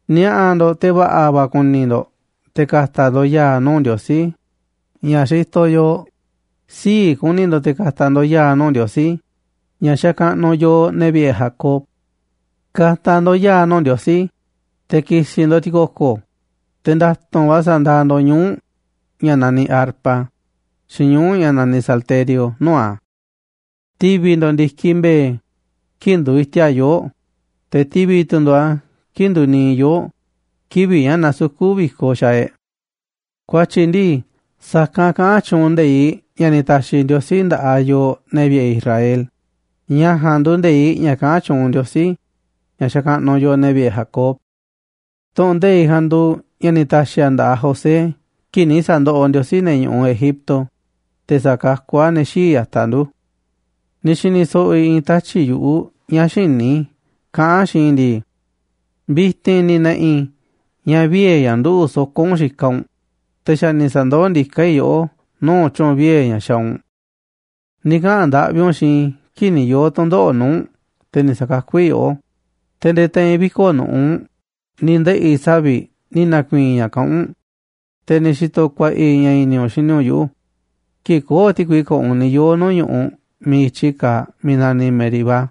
Ni̱a̱ꞌa̱ ndo̱ꞌ, te̱ va̱ꞌa̱ va̱ kuni ndo̱ꞌ te̱ ka̱ta̱ ndo̱ꞌ ya̱a̱ nuu̱ꞌ Ndiosí ña̱ xitoꞌ yooꞌ, sii̱ꞌ ku̱ni̱ ndo̱ꞌ te̱ ka̱ta̱ ndo̱ꞌ ya̱a̱ nuu̱ꞌ Ndiosí ña̱ xakaꞌnuꞌ yooꞌ, ne̱ vi̱ꞌe̱ Jacob. Ka̱ta̱ ndo̱ꞌ ya̱a̱ nuu̱ꞌ Ndiosí, te̱ ki̱si̱ ndo̱ꞌ ti̱ko̱ko̱, te̱ nda̱tu̱nꞌ va̱ sa̱ndaaꞌ ndo̱ꞌ ñuu̱ꞌ ña̱ naniꞌ arpa xiinꞌ ñuu̱ꞌ ña̱ naniꞌ salterio nuu̱ꞌ a̱. Ti̱vi̱ ndo̱ꞌ ndi̱kiꞌ mbe̱e̱ kii̱ꞌ nduuꞌ iti̱a̱ꞌ yoo̱ꞌ, te̱ ti̱vi̱ tu̱ ndo̱ꞌ a̱ kii̱ꞌ nduuꞌ niiꞌ yoo̱ꞌ kivi̱ꞌ ña̱ nasukú vi̱koꞌ xaaꞌ e̱ꞌ. Ku̱a̱tyi̱ ndii, sa̱kanꞌ kaꞌán tyuunꞌ nde̱iꞌ ña̱ ni̱ ta̱xi̱ Ndiosí nda̱ꞌaꞌ yooꞌ, ne̱ vi̱ꞌe̱ Israel, ña̱ ja̱a̱nꞌ nduuꞌ nde̱iꞌ ña̱ kaꞌán tyuunꞌ Ndiosí ña̱ xakaꞌnuꞌ yooꞌ, ne̱ vi̱ꞌe̱ Jacob. Tu̱ꞌu̱n nde̱iꞌ ja̱a̱nꞌ nduuꞌ ña̱ ni̱ ta̱xi̱ a̱ nda̱ꞌaꞌ José kii̱ꞌ ni̱ sa̱ndoꞌoꞌ Ndiosí ne̱ ñu̱ꞌuꞌ Egipto, te̱ sa̱kakú a̱ ne̱ xii̱ꞌ ya̱taꞌ ndu̱. Ni̱ xi̱ni̱ so̱ꞌo̱ i̱ i̱i̱n tatyi̱ꞌ yu̱ꞌuꞌ ña̱ xïní i̱ kaꞌán a̱ xiinꞌ i̱ ndi̱i: “Vi̱ti̱n ni̱ na̱ꞌi̱ i̱ ña̱ vie̱ ña̱ nduꞌu̱ꞌ soko̱ u̱nꞌ xikaꞌ u̱nꞌ, te̱ xa̱ ni̱ sa̱ndoó ndiká i̱ yoꞌó nuu̱ꞌ tyu̱u̱n vie̱ ña̱ xaaꞌ u̱nꞌ. Ni̱ kaꞌa̱n ndaꞌvi u̱nꞌ xiinꞌ i̱ kii̱ꞌ ni̱ yoo̱ tu̱ndoꞌo̱ꞌ nuu̱ꞌ u̱nꞌ, te̱ ni̱ sa̱kakú i̱ yoꞌó, te̱ nde̱e̱ te̱i̱n viko̱ꞌ nu̱ꞌuꞌ ni̱ ndeꞌi̱ savi̱ꞌ ni̱ na̱ku̱i̱i̱n i̱ ña̱ kaꞌán u̱nꞌ, te̱ ni̱ xi̱to̱ ku̱a̱ꞌa̱ i̱ ña̱ i̱ni̱ u̱nꞌ xini u̱nꞌ yuꞌu̱ kii̱ꞌ köo̱ꞌ ti̱kui ko̱ꞌo̱ u̱nꞌ ni̱ yoo̱ nuu̱ꞌ ñu̱ꞌuꞌ miiꞌ i̱tyi kaaꞌ miiꞌ naniꞌ Meribá.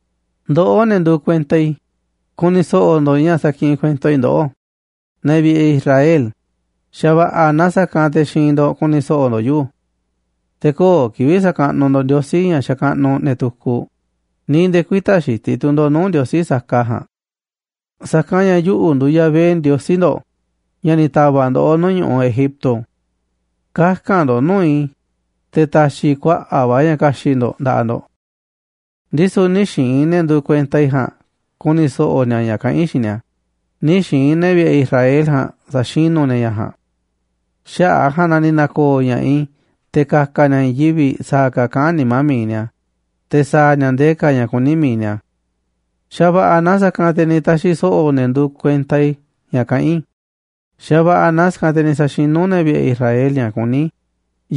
Ndoꞌó, ne̱ nduuꞌ kuenta i̱, ku̱ni̱ so̱ꞌo̱ ndo̱ꞌ ña̱ sakiꞌinꞌ kuento i̱ ndoꞌó, ne̱ vi̱ꞌe̱ Israel, xa̱va̱ꞌa̱ naaꞌ sa̱kanꞌ te̱ xiinꞌ ndo̱ꞌ ku̱ni̱ so̱ꞌo̱ ndo̱ꞌ yuꞌu̱. Te̱ köo̱ꞌ kivi̱ꞌ sa̱kaꞌnuꞌ ndo̱ꞌ ndiosí ña̱ xakaꞌnuꞌ ne̱ tukuꞌ, ni̱ nde̱e̱ kü̱i̱ta̱ xitiꞌ tu̱ ndo̱ꞌ nuu̱ꞌ ndiosí saka ja̱a̱nꞌ. Sa̱kanꞌ ña̱ yuꞌu̱ nduuꞌ Yahvé Ndiosí ndo̱ꞌ, ña̱ ni̱ ta̱va̱ꞌ ndoꞌó nuu̱ꞌ ñu̱ꞌuꞌ Egipto. Kaka̱n ndo̱ꞌ nuu̱ꞌ i̱, te̱ ta̱xi̱ i̱ kuaꞌa̱ꞌ va̱ ña̱ ka̱xi̱ꞌ ndo̱ꞌ nda̱ꞌaꞌ ndo̱ꞌ. Ndisu̱ nï̱ xi̱i̱n ne̱ nduuꞌ kuenta i̱ ja̱a̱nꞌ ku̱ni̱ so̱ꞌo̱ ni̱a̱ ña̱ kaꞌán i̱ xiinꞌ ni̱a̱, nï̱ xi̱i̱n ne̱ vi̱ꞌe̱ Israel ja̱a̱nꞌ sa̱xinú ni̱a̱ ña̱ ja̱a̱nꞌ. Xaꞌa̱ꞌ a̱ ja̱a̱nꞌ na ni̱ na̱ko̱o̱ ña̱ꞌaꞌ i̱ te̱ ka̱ka̱ ni̱a̱ i̱i̱n yivi̱ꞌ sa̱a̱ ka̱ kaꞌán nimá mi̱iꞌ ni̱a̱, te̱ sa̱a̱ ni̱a̱ ndee ka̱ ña̱ kuní mi̱iꞌ ni̱a̱. Xa̱va̱ꞌa̱ naaꞌ sa̱kanꞌ te̱ ni̱ ta̱xi̱ so̱ꞌo̱ ne̱ nduuꞌ kuenta i̱ ña̱ kaꞌán i̱, xa̱va̱ꞌa̱ naaꞌ sa̱kanꞌ te̱ ni̱ sa̱xinú ne̱ vi̱ꞌe̱ Israel ña̱ kuní i̱,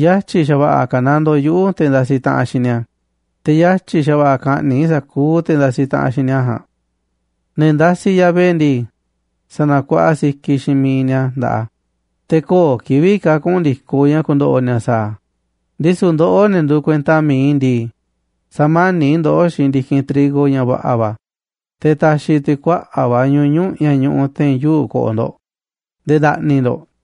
yatyi̱ xa̱va̱ꞌa̱ ka̱nandoo yuꞌu̱ te̱ ndasiꞌ taꞌanꞌ xiinꞌ ni̱a̱, te̱ yatyi̱ xa̱va̱ꞌa̱ ka̱ꞌni̱ꞌ i̱ sa̱kuuꞌ te̱ ndasiꞌ taꞌanꞌ xiinꞌ ni̱a̱ ja̱a̱nꞌ. Ne̱ ndasiꞌ Yahvé ndii, sa̱na̱kuaꞌa sikiꞌ xiinꞌ mi̱iꞌ ni̱a̱ nda̱ꞌaꞌ a̱, te̱ köo̱ꞌ kivi̱ꞌ ka̱ kuꞌu̱n ndi̱koꞌ ña̱ ku̱ndo̱ꞌo̱ ni̱a̱ sa̱a̱ a̱. Ndisu̱ ndoꞌó, ne̱ nduuꞌ kuenta mi̱iꞌ i̱ ndii, sa̱mani̱ꞌ i̱ ndoꞌó xiinꞌ ndi̱kinꞌ trigo ña̱ va̱ꞌa̱ va̱, te̱ ta̱xi̱ tu̱ i̱ kuaꞌa̱ꞌ va̱ ñuñu̱ꞌ ña̱ ñuꞌuꞌ te̱i̱n yuu̱ꞌ ko̱ꞌo̱ ndo̱ꞌ nde̱e̱ nda̱ꞌni̱ ndo̱ꞌ”, katyi̱ a̱.